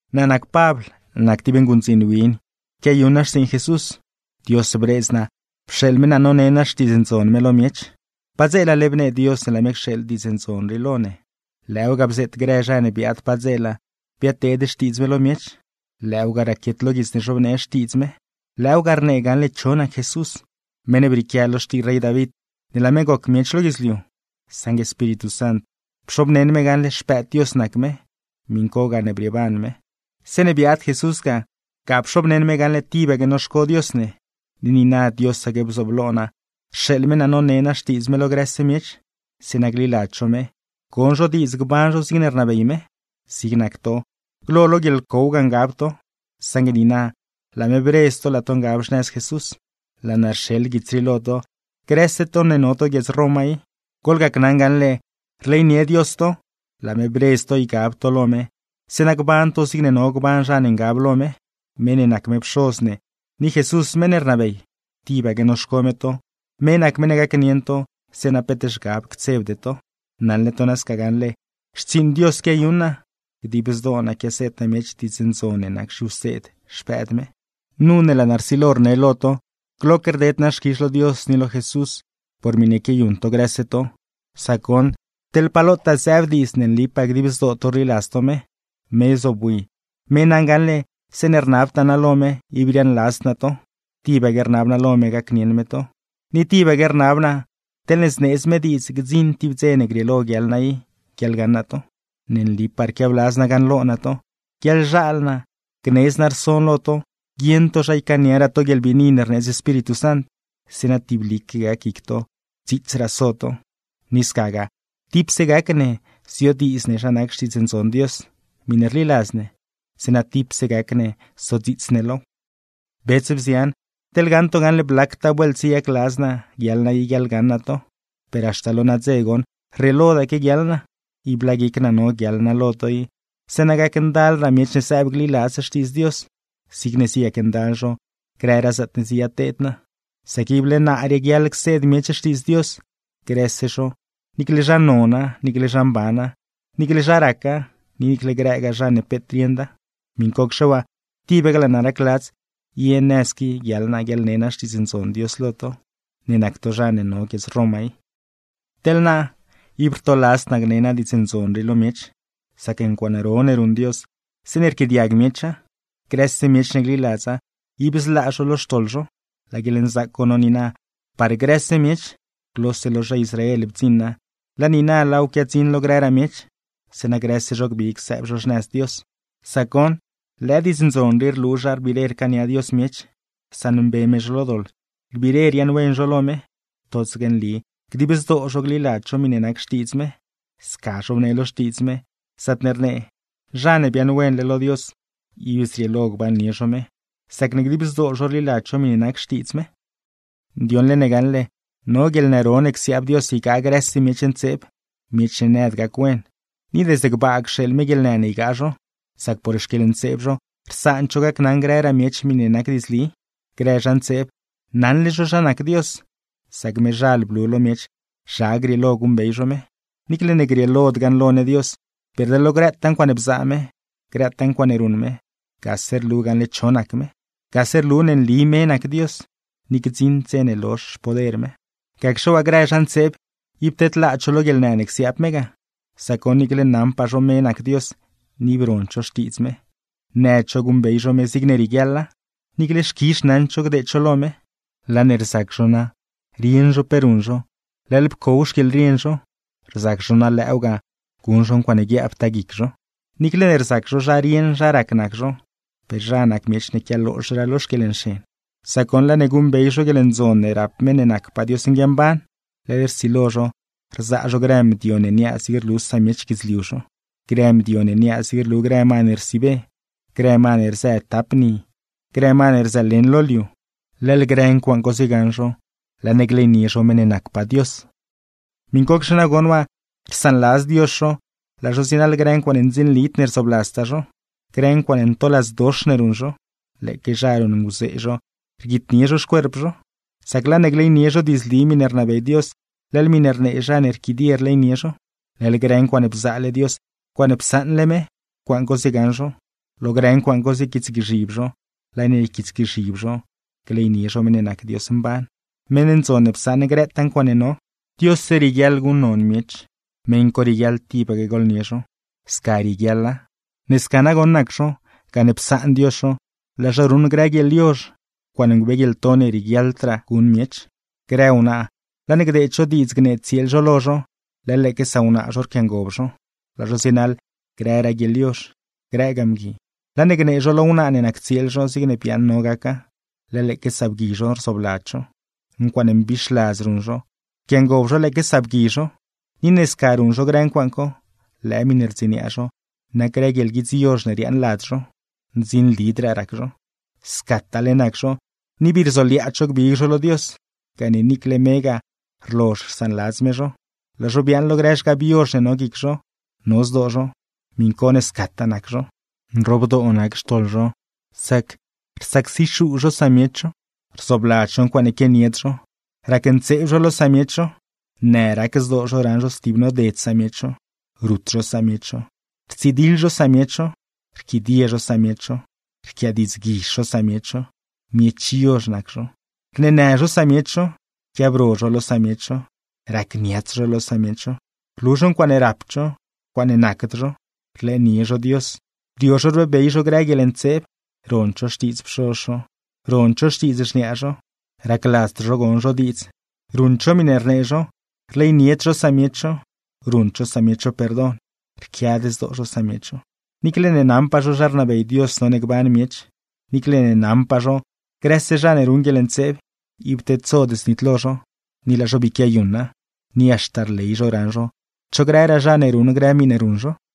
Naa nac Pabl, naa nac tib nguṉdziin win quiayuṉ naa xtsiiṉ Jesús. Dios bredz naa pxeeḻ me naa none naa Xtiidz Ndzon me lo miech. Padzeelale bnee Dios ne laa me cxeeḻ Diidz Ndzon rii lo ne, lëëw ga bzeet grë zha ne biaad padzeela biadteed xtiidz me lo miech, lëëw ga raquiet lo guits ne zhobnee Xtiidz me. Lëëw ga rnee gaṉle cho nac Jesús (meṉ ne brieequia lo xtii rey David ne laa me goc miech lo guidzliu; saṉgue Espíritu Sant, pxobneṉ me gaṉle Xpëëd Dios nac me; miṉ co gane brieeban me). Zeeṉe biaad Jesús, ga pxobneṉ me gaṉle tibaque noxco Dios ne; ni niina Diosaque bzooblo naa rxeeḻ me naa none naa Xtiidz me lo grëse miech, zeeṉa gliladz zho me, gon zho diidz gban zho zigne rnabey me. Zig nac to, glo lo guieḻcow ga ngab to; saṉgue niina laa me bredz to laa to ngab xnëz Jesús. Laa naa rxeḻ guits rii lo to, grëse to ne no to guiedz Roma i. Goḻgacnaṉ gaṉle rleynie Dios to, gane laa me bredz to ygab to lo me, gban to zigne no gban zha ne ngab lo me. Me ne nac me Pxoz ne, ni Jesús meṉ ne rnabey, tibaque noxco me to, me nac meṉ ne gacnieṉ to zeeṉa peet zhgab ctsebde to. Naṉle to nasca gaṉle xtsiiṉ Dios quiayuṉ naa, dib zdoo naa quiaseed naa miech Diidz Ndzon ne nac zhiwseed Xpëëd me. Nu ne laa naa rsilo rne lo to, gloque rded naa xquizh lo Dios ni lo Jesús por miṉe quiayuṉ to grëse to, sac goṉ teḻ pa lotaa zëëb diidz ne nlipaa dib zdoo to rliladz to me. Me zobwi, me naṉ gaṉle zeeṉe rnabtaa naa lo me, ib riaaṉladzd naa to, tibaque rnab naa lo me gacnieṉ me to; ni tibaque rnab naa teḻne zneedz me diidz gdziṉ tib dze ne grieelo guiaḻ naa i guiaḻgaṉ naa to. Ne nlipaa rquiabladz naa gaṉlo naa to, guiaḻzhaal naa gnedz naa rson lo to guieṉ to zha ycaaniaraa to guieḻbiini ne rneedz Espíritu Sant; zeeṉa tiblique gac guic to dziitsraa so to. Ni scagaa tipse gac ne ziodiidz ne zha nac Xtiidz Ndzon Dios, miṉe rliladz ne; zeeṉa tipse gac ne sodziits ne low. Bets, bzian, teḻ gaṉ to gaṉle blactaa vuelt ziyacladz naa guiaḻ naa i guiaḻgaṉ naa to, per haxta lo nadze goṉ rrieelodaque guiaḻ naa. Ib laa guic naa no guiaḻ naa lo to i, zeeṉa gacndalraa miech ne sëëb gliladz Xtiidz Dios, zigne ziyacndal zho grëraa zaatne ziyateed naa. Sac ible naa raguiaḻ cseed miech Xtiidz Dios, grëse zho niicle zha nona, niicle zha mbana; niicle zha raca, ni niicle grëgaa zha ne peet rieṉda. Miṉcocxe waa, tibaque laa naa racladz ye nëz qui guiaḻ naa guiaḻne naa Xtiidz Ndzon Dios lo to, ne nac to zha ne no guiedz Roma i. Teḻ naa, ib rtoladzd naa gne naa Diidz Ndzon rii lo miech, sac ncuaaṉ ro ne ruṉ Dios zeeṉe rquiaadiag miecha. ¡Grëse miech ne gliladza, ib zlaa zho lo xtoḻ zho! Laa guieḻnzaac co no niina par grëse miech. Glose lo zha Israel bdziṉa, laa niina laaw quiadziṉ lo grëraa miech, zeeṉa grëse zho gbig sëëb xnëz Dios. Sac goṉ, lëë Diidz Ndzon rii rlu zha rbiire rcaania Dios miech, rsaṉmbe me zho lo doḻ rbiire riaaṉwen zho lo me: totsaque nli dib zdoo zho gliladz zho miṉe nac Xtiidz me. Sca zhobnee lo Xtiidz me, zaatne rnee: “Zha ne biaaṉwenle lo Dios, ib zrieelo gbannie zho me, sacne dib zdoo zho rliladz zho miṉe nac Xtiidz me.” Ndioṉle ne gaṉle no guieḻnë ro ne csiaab Dios ygaa grëse miech ntseeb, miech ne nëd gac-wen, ni desde gbaa cxeeḻ me guieḻnë ne ygaa zho; sac por xquieḻntseeb zho rsaand zho gacnaṉ grëraa miech miṉe nac diidzli. Grë zha ntseeb, naṉle zho zha nac Dios, sac mezhal blu lo miech zha grieelo guṉbey zho me. Niicle ne grieelod gaṉlo ne Dios, per de lo grëtaa ncuaaṉe bzaa me, grëtaa ncuaaṉe ruṉ me, gase rlu gaṉle cho nac me. ¡Gase rlu ne nli me nac Dios, ni gdziṉd dze ne lozh xpoder me! Gacxe waa grë zha ntseeb, ib tedlaad zho lo guieḻnë ne csiaab me ga; sac goṉ niicle naṉpaa zho me nac Dios, ni ib rond zho xtiidz me. Nëd zho guṉbey zho me zigne rieguiaḻa, niicle xquizh naṉd zho gdeed zho lo me. Laa ne rzac zho na rieṉ zho pe ruṉ zho, leḻ pcow xquieḻrien zho; rzac zho na lëëw ga, guṉ zho ncuaaṉe guiaabtaa guic zho. Niicle ne rzac zho zharieṉ zharac nac zho, per zha nac miech ne quialoozhraa lo xquieḻnxen; sac goṉ laa ne guṉbey zho guieḻndzon ne rap meṉ ne nacpaa Dios nguiamban, leḻ rsilo zho rzaa zho grë mdio ne niaa zigne rlu samiech guidzliu zho, grë mdio ne niaa zigne rlu grë ma ne rsiibe, grë ma ne rzë tap ni, grë ma ne rzëleṉ lo liu; leḻ grë ncuaaṉ co ziegaṉ zho laa ne gleynie zho meṉ ne nacpaa Dios. Miṉcocxe nagoṉ waa, rsaanladz Dios zho laa zho zienaḻ grë ncuaaṉe ndzinlid ne rzoobladztaa zho. Grë ncuaaṉe ntoladzdox ne ruṉ zho, lëëque zha ruṉnguzee zho rguitnie zho xcuerp zho. Sac laa ne gleynie zho diidzli miṉe rnabey Dios, leḻ miṉe rnee zha ne rquidie rleynie zho; leḻ grë ncuaaṉe bzaale Dios, ncuaaṉe psaṉle me, ncuaaṉ co ziegaṉ zho, lo grë ncuaaṉ co ziequiitsgzhib zho; laa ne yquiitsgzhib zho, gleynie zho meṉ ne nac Dios mban, meṉ ndzon ne psaṉ grëtaa ncuaaṉe no. ¡Diosse rieguiaḻ guṉnon miech, meṉ co rieguiaḻ tibaque gooḻnie zho! Sca rieguiaḻa. Ne sca nagoṉ nac zho, gane psaan Dios zho laa zho ruṉ grë guieḻyozh, ncuaaṉe ngubeeguieḻto ne rieguiaḻdraa guṉ miech. Grë wnaa laa ne gdeed zho diidz gnee tsieel zho lo zho, leḻ lëëque sawnaa zho rquiangob zho, laa zho zienaḻ grëraa guieḻyozh; grëgaa mgui, laa ne gnee zho lo wnaa ne nac tsieel zho zigne biaaṉ no gaca, leḻ lëëque sabgui zho rzoobladz zho. Ncuaaṉe mbixladz ruṉ zho, rquiangob zho lëëque sabgui zho; ni ne sca ruṉ zho grë ncuaaṉ co, lëë miṉe rdziniaa zho nac grë guieḻguidz yozh ne riaaṉ lad zho; ndzinlidraa rac zho. Scataale nac zho, ni bii rzoliaadz zho gbig zho lo Dios, gane niicle megaa rlozh rsaanladz me zho, laa zho biaaṉ lo grë zhgab yozh ne no guic zho, no zdoo zho, miṉ co ne scataa nac zho. Nroobdoo nac xtoḻ zho, sac: rsacsixuu zho samiech zho, rzoobladz zho ncuaaṉe quianied zho, racntseeb zho lo samiech zho, në rac zdoo zho raṉ zho stib noded samiech zho, rut zho samiech zho, rtsidiḻ zho samiech zho, rquidie zho samiech zho, rquiadiidzguizh zho samiech zho, miech yozh nac zho, rneenë zho samiech zho, rquiabro zho lo samiech zho, racniats zho lo samiech zho, rlu zho ncuaaṉe rapd zho, ncuaaṉe nacd zho; rlëënie zho Dios, rio zho rbeebey zho grë guieḻntseeb, rond zho xtiidz pxoz zho, rond zho xtiidz xniaa zho, racladzd zho gon zho diidz, ruṉd zho miṉe rnee zho, rleynied zho samiech zho, ruṉd zho samiech zho perdon, rquiad zdoo zho samiech zho. Niicle ne naṉpaa zho zha rnabey Dios none gban miech, niicle ne naṉpaa zho grëse zha ne ruṉ guieḻntseeb, ib tedsod znitlo zho; ni laa zho bii quiayuṉa, ni haxta rley zho raṉ zho cho grëraa zha ne ruṉ grë miṉe ruṉ zho.